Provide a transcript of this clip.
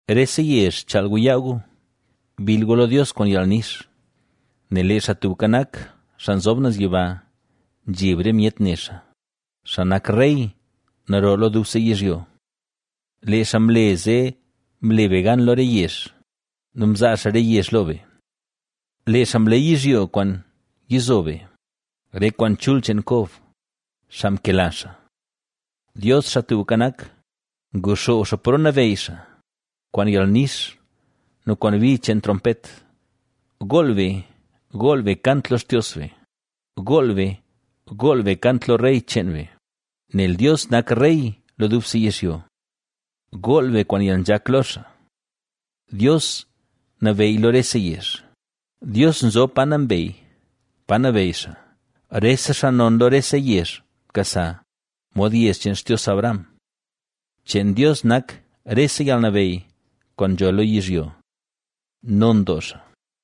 ¡Rese yezh, chaal gu yaa gu! ¡Bill gu lo Dios kwaan yalnix! Nel lee Xaa Tubka Nak, Xaa Nzob Naz Yiba, zheb re myet ne xaa, Na xaa nak rey naro lo dubse yizhyo. Lee xaa mle zee mle be gan lo re yezh nu mzaa xaa re yezh lo be. Lee xaa mleey yizhyo kwaan nyizo be, re kwaan chul cheen Kob, xaa mkela xaa. ¡Dios, Xaa Tubka Nak, nguxoob xaa paro nabeyy xaa, kwaan yalnix nu kwaan bi cheen trompet! ¡Gool be, gool be kant lo Xtios be! ¡Gool be, gool be kant lo Rey cheen be! Nel Dios, nak Rey lo dubse yizhyo. Gool be kwaan yalnzhak lo xaa. Dios nabeyy lo rese yezh; Dios nzob pa nambey, pa nabeyy xaa. Rese xaa non lo rese yezh mkasa, mod yezh cheen Xtios Abraham. Cheen Dios nak rese yalnabeyy kwaan nzho lo yizhyo. ¡Non doo xaa!